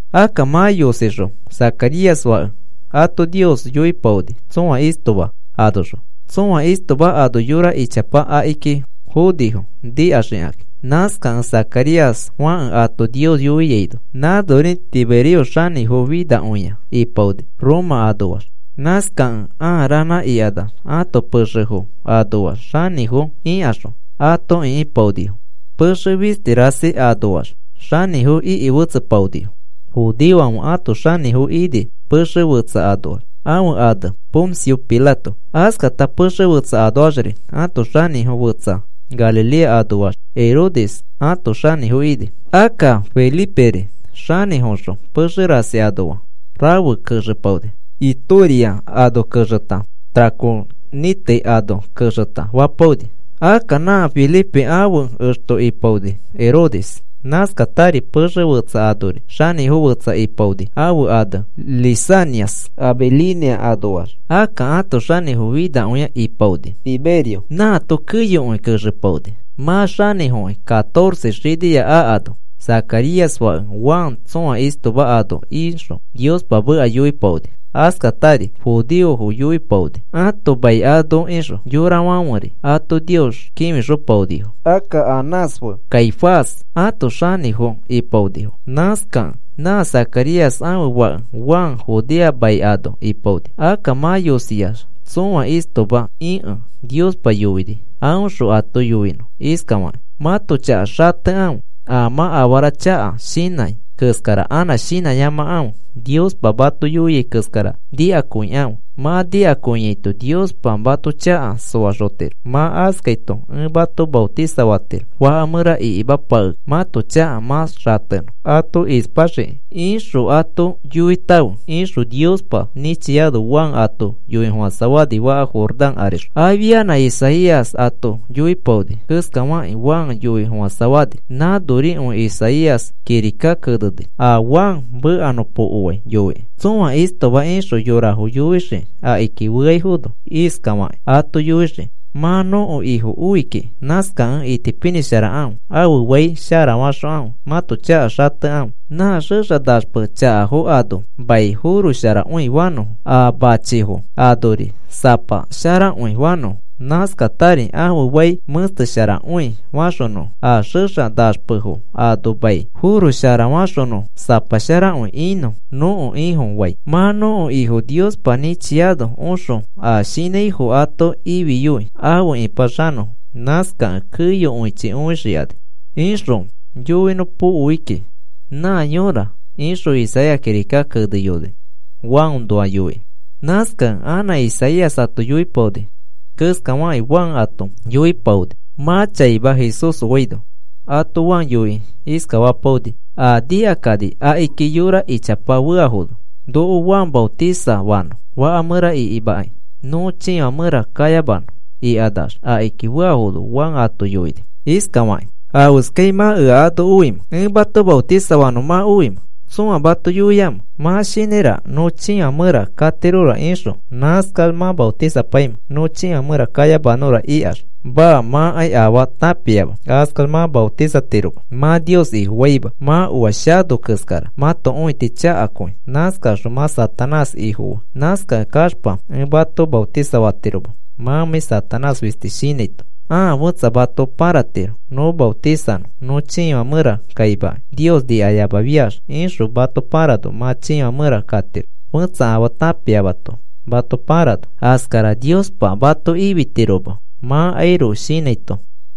Akka mã yosixõ Zacarías fãke ato Nios yoipaoni tsõa istoma anoxõ. Tsõa istoma ano yora ichapa akiki fonifo nikaxikakĩ, nãskakẽ Zacarías fãke ato Nios yoiaino. Nãnori Tiberio xanĩfo finakõia ipaoni, Roma anoax. Nãskakẽ aa ranã ikanax ãto pexefo anoax xanĩfo ikaxõ ato ikĩpaonifo. Pexe fisti rasi anoax xanĩfo iki fetsepaonifo. Judeofãfe ãto xanĩfo ini pexe fetsa anoax ãfe ane Poncio Pilato. Askata pexe fetsa anoaxri ãto xanĩfo fetsa Galilea anoax Herodes ato xanĩfo ini. Akka Feliperi xanĩfoxõ pexe rasi anoa rafe kexepaoni. Itoria ano kexeta Traconite ano kexeta fapaoni. Akka nã Felipe ãfe exto ipaoni Herodes. Nãskatari pexe fetsa anori xanĩfo fetsa ipaoni ãfe ane Lisanias Abilinia anoax. Akka ãto xanĩfo finakõia ipaoni Tiberio. Nãato keyokõi kexepaoni. Mã xanĩfokĩ catorce xinia akano Zacarías fake Juan tsõa istoma ano ixõ Niospa meka yoipaoni. Askatari judeofo yoipaoni ãto mai ano ixõ, yorafãferi ato Nios kĩfixopaonifo. Akka Anás fe Caifás ãto xanĩfo ipaonifo. Nãskakẽ nã Zacarías ãfe fake Juan Judea mai ano ipaoni. Akka mã yosiax tsõa istoma ikẽ Niospa yoini aõxõ ato yoinõ iskafakĩ: “Mãto chaka xatekãfe, a mã afara chaka shinãi keskara anã shinãyamakãfe. Niospa mato yoiai keskara nikakõikãfe. Mã nikakõiaito Niospa mato chaka soaxotiro. Mã askaito ẽ mato maotisafatiro, faka mẽra ikimapakekĩ mãto chaka mã xatenõ ato ispaxiki ixõ ato yoitãfe,” ixõ Niospa nĩchiano Juan ato yoifofãsafani faka Jordán arixõ. Afia Isaías ato yoipaoni keskafakĩ Juan yoifofãsafani. Nãnorikõi Isaías kirika keneni a Juan mekanõpokofai yoikĩ: Tsõa istoma ixõ yorafo yoixii akiki feaifono. Iskafakĩ ato yoixii: “Mã nõko Ifo oi kiki. Nãskakẽ itipinĩsharakãfe, ãfe fai sharafaxokãfe. Mãto chaka xatekãfe. Nã xexa naxpe chakafo ano mai forosharakõi fanõfo. A machifo anori sapa sharakõi fanõfo. Nãskatari ãfe fai mẽstesharakõi faxonõfo. A xexa naxpefo ano mai forosharafaxonõfo sapa sharakõi inõ nõko Ifofai. Mã nõko Ifo Niospa nĩchiano oxõ a shinãifo ato ifiyoi afe ĩpaxanõfo. Nãskakẽ keyokõichi õixikani,” ixõ yoinõpokoi kiki nã yõra, ixõ Isaías kirika keneyoni, Juannoa yoikĩ. Nãskakẽ nã Isaías ato yoipaoni keskafakĩ Juan ato yoipaoni, mã chaima Jesús oaino. Ato Juan yoikĩ iskafapaoni, a nikakani akiki yora ichapa feafono: “Noko Juan maotisafanõ faka mẽra ikimakĩ nõ chiifã mẽra kayamanõ,” ikanax akiki feafono Juan ato yoini iskafakĩ: “¿Afeskai mã ea ano oimẽ? ¿Ẽ mato maotisafapanõ mã oimẽ? ¿Tsõa mato yoiamẽ? Mã shinãiraka nõ chiifã mẽra katirora ixõ nãskax mã maotisapaimẽ, nõ chiifã mẽra kayamanõra ikax. Maa, mãkai afaa tãpiama, askax mã maotisatiroma. Mã Nios Ifofaima. Mã oa shano keskara mãto õiti chakakõi. Nãskaxõ mã Satanás ifofaa. Nãskakẽ kaxpa ẽ mato maotisafatiroma mãmãi Satanás fisti shinãito. Ãa fẽtsa mato pãratiro nõ maotisanõ nõ chiifã mẽra kaimakai Nios nikayamafiax ixõ mato pãrano mã chiifã mẽra katiro fẽtsa afaa tãpiamato mato pãrano. Askara Niospa mato ifitiroma mãkairoko shinãito,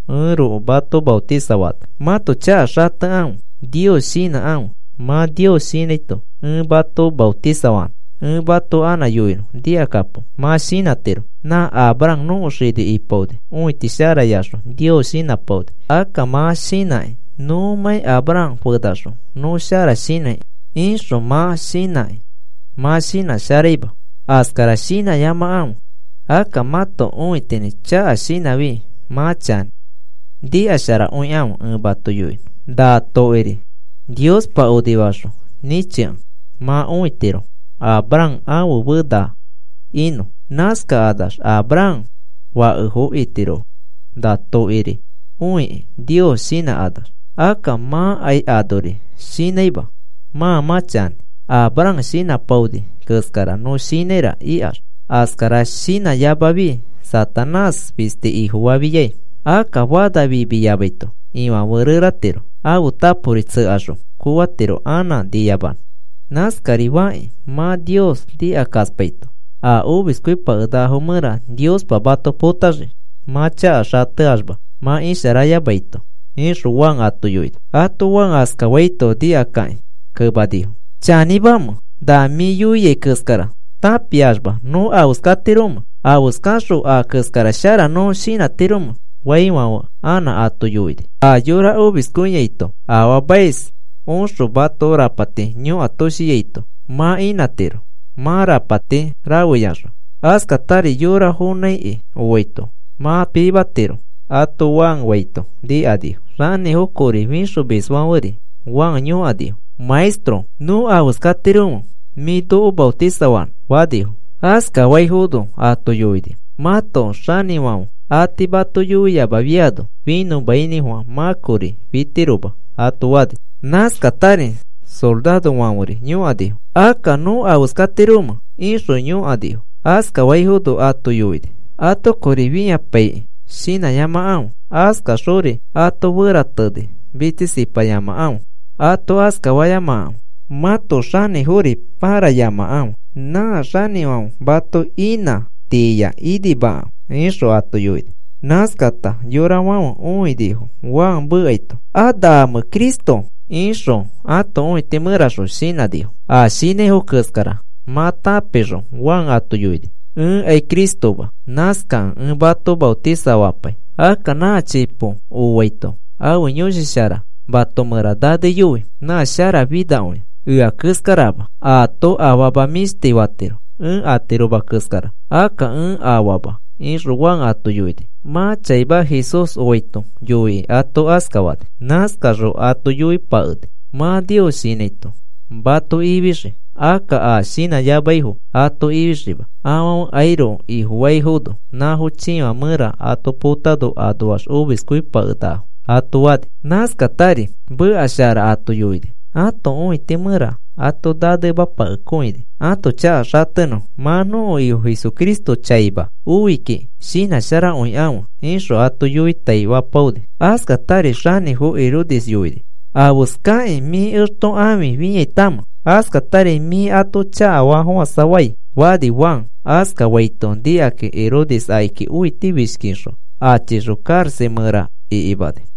ẽroko mato maotisafaano. Mãto chaka xatekãfe, Nios shinãkãfe. Mã Nios shinãito ẽ mato maotisafapanõ. Ẽ mato anã yoinõ nikakapo. Mã shinãtiro: ‘Nã Abraham nõko xini ipaoni, õiti sharayaxõ Nios shinãpaoni.’ Akka mã shinãkĩ: ‘Nõmãi Abraham fenaxõ nõ shara shinãi,’ ixõ mã shinãkĩ mã shinãsharaima. Askara shinãyamakãfe. Akka mãto õitinĩ mã chaka shinãfi mã chanĩ. Nikasharakõikãfe, ẽ mato yoinõ. Na tokiri Niospa onifaxõ nĩchikẽ mã õitiro Abraham ãfe fena inõ. Nãskakanax Abraham fakefo itirofo na tokiri õiki Nios shinãkanax. Akka mãkai anori shinãima mã mã chanĩ, ‘Abraham shinãpaoni keskara nõ shinãira’ ikax. Askara shinãyamafi Satanás fisti ifofafiai. Akka fana fimiyamaito ifãfe reratiro. Ãfe tapori tsekaxõ kooatiro anã niyamanõ. Nãskari fakĩ mã Nios nikakaspaito a omiskõipakenakafo mẽra Niospa mato potaxii mã chaka xateaxma mã isharayamaito,” ixõ Juan ato yoini. Ato Juan askafaito nikakakĩ kemanifo: “¿Chanĩmamẽ? ¿Na mĩ yoiai keskara tãpiaxma nõ afeskatiromẽ? ¿Afeskaxõ a keskara shara nõ shinãtiromẽ?” faifãfe anã ato yoini: “A yora omiskõiaito afaamais oxõ mato rapati yõkatoshiaito mã inãtiro mã rapati rafeyaxõ. Askatari yora fonãiki oaito mã pimatiro,” ato Juan faito nikanifo. Xanĩfo kori fixomisfãferi Juan yõkanifo: “Maestro, ¿nõ afeskatiromẽ, mĩ noko maotisafanõ?” fanifo. Askafaifono ato yoini: “Mãto xanĩfãfe a tii mato yoiyamafiano finõmainĩfofã mã kori fitiroma,” ato fani. Nãskatari sorarofãferi yõkanifo: “Akka, ¿nõ afeskatiromẽ?” ixõ yõkanifo. Askafaifono ato yoini: “Ato kori fĩapiakĩ shinãyamakãfe. Askaxori ato ferateni mitsisipayamakãfe. Ato askafayamakãfe. Mãto xanĩfori pãrayamakãfe. Nã xanĩfãfe mato inã tiiya inimakãfe,” ixõ ato yoini. Nãskata yorafãfe õinifo Juan mekaito. “¿A naamẽ Cristo?” ixõ ãto õiti mẽraxõ shinãnifo. A shinãifo keskara mã tãpixõ Juan ato yoini: “Ẽkai Cristoma. Nãskakẽ ẽ mato maotisafapai. Akka nã chipo oaito ãfe Yõshi Shara mato mẽra naneyoi. Nã sharafinakõia, ea keskarama. Aato afama mĩshti fatiro, ẽ atiroma keskara. Akka ẽ afaama,” ixõ Juan ato yoini. Mã chaima Jesús oaito yoikĩ ato askafani. Nãskaxõ ato yoipakeni: “Mã Nios shinãito mato ifixii. Akka a shinãyamaifo ato ifixiima. Afãfekairoko ifofaifono nãfo chiifã mẽra ato potano anoax omiskõipakenakafo” ato fani. Nãskatari meka shara ato yoini, ãto õiti mẽra ato nanemapaikõini ãto chaka xatenõfo. “Mã nõko Ifo Jesucristo chaima oi kiki, shinãsharakõikãfe,” ixõ ato yoitaifapaoni. Askatari xanĩfo Herodes yoini: “¿Afeskakĩ mĩ exto ãfi fĩaitamẽ? Askatari mĩ ato chakafafofãsafai,” fani Juan. Askafaito nikakĩ Herodes akiki õitifishkixõ achixõ karaxa mẽra ikimani.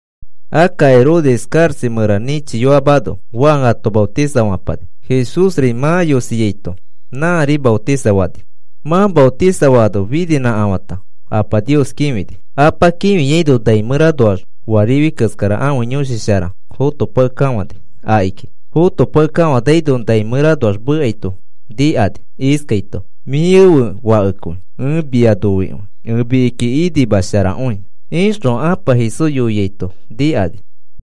Akka Herodes karaxa mẽra nĩchiyoamano Juan ato maotisafapani. Jesúsri mã yosiaito nãri maotisafani. Mã maotisafaano fininãkafãta Apa Nios kĩfini. Apa kĩfiaino nai mẽranoax oa rifi keskara ãfe Yõshi Shara fotopakekafãni akiki. Fotopakekafanaino nai mẽranoax mekaito nikani iskaito: “Mĩ ẽfe Fakekõi ẽ mia noikõi. Ẽ mikiki inimasharakõi,” ixõ Apa Jesús yoiaito nikani.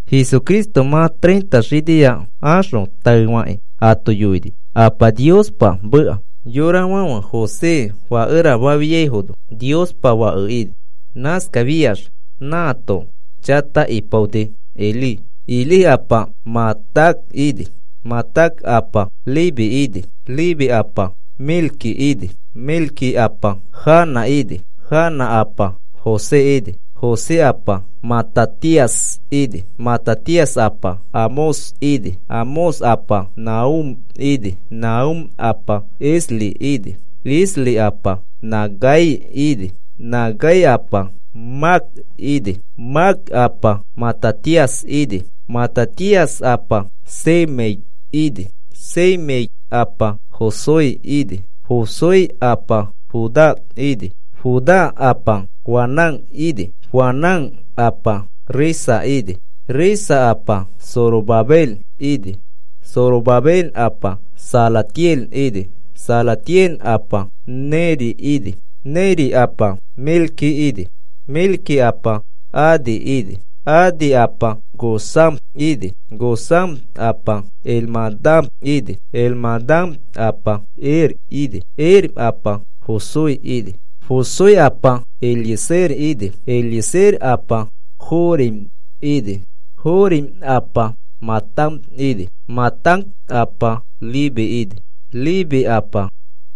Jesucristo mã treinta xinia axõ taefakĩ ato yoini Apa Niospa meka. Yorafãfe José fakera fafiaifono Niospa Fake ini. Nãskafiax nãato chata ipaoni Elí. Elí apa Matat ini. Matat apa Leví ini. Leví apa Melqui ini. Melqui apa Jana ini. Jana apa José ini. José apa Matatías ini. Matatías apa Amós ini. Amós apa Nahúm ini. Nahúm apa Esli ini. Esli apa Nagai ini. Nagai apa Maat ini. Maat apa Matatías ini. Matatías apa Semei ini. Semei apa Josec ini. Josec apa Judá ini. Judá apa Joanán ini. Joanán apa Resa ini. Resa apa Zorobabel ini. Zorobabel apa Salatiel ini. Salatiel apa Neri ini. Neri apa Melqui ini. Melqui apa Adí ini. Adí apa Cosam ini. Cosam apa Elmadam ini. Elmadam apa Er ini. Er apa Josué ini. Josué apa Eliezer ini. Eliezer apa Jorim ini. Jorim apa Matat ini. Matat apa Leví ini. Leví apa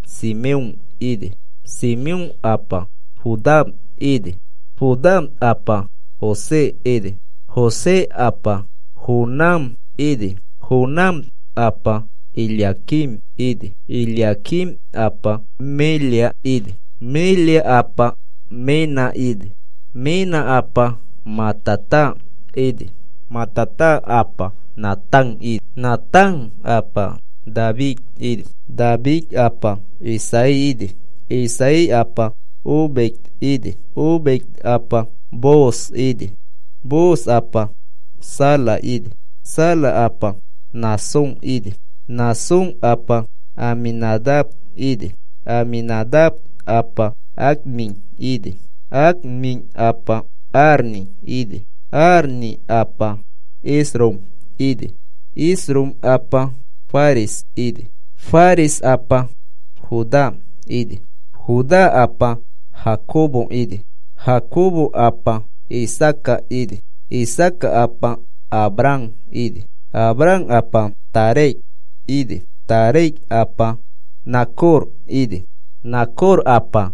Simeón ini. Simeón apa Judá ini. Judá apa José ini. José apa Jonam ini. Jonam apa Eliaquim ini. Eliaquim apa Melea ini. Melea apa Mena ini. Mena apa Matata ini. Matata apa Natán ini. Natán apa David ini. David apa Isaí ini. Isaí apa Obed ini. Obed apa Booz ini. Booz apa Sala ini. Sala apa Naasón ini. Naasón apa Aminadab ini. Aminadab apa Admín ini. Admín apa Arni ini. Arni apa Esrom ini. Esrom apa Fares ini. Fares apa Judá ini. Judá apa Jacobo ini. Jacobo apa Isaaca ini. Isaaca apa Abraham ini. Abraham apa Taré ini. Taré apa Nacor ini. Nacor apa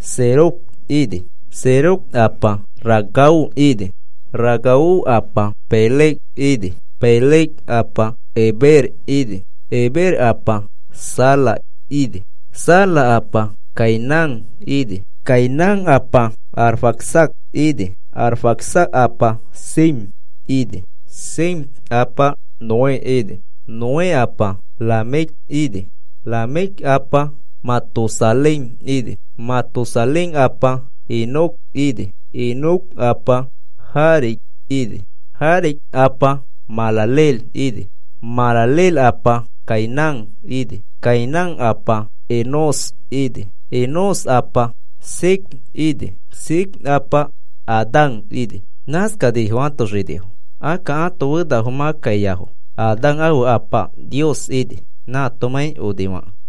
Serug ini. Serug apa Ragau ini. Ragau apa Peleg ini. Peleg apa Heber ini. Heber apa Sala ini. Sala apa Cainán ini. Cainán apa Arfaxad ini. Arfaxad apa Sem ini. Sem apa Noé ini. Noé apa Lamec ini. Lamec apa Matusalén ini. Matusalén apa Enoc ini. Enoc apa Jared ini. Jared apa Mahalaleel ini. Mahalaleel apa Cainán ini. Cainán apa Enós ini. Enós apa Set ini. Set apa Adán ini. Nãskanifo ãto xinifo. Akka ãto fenafo mã kaiafo. Adán ãfe apa Nios ini, nãatomãi onifakẽ.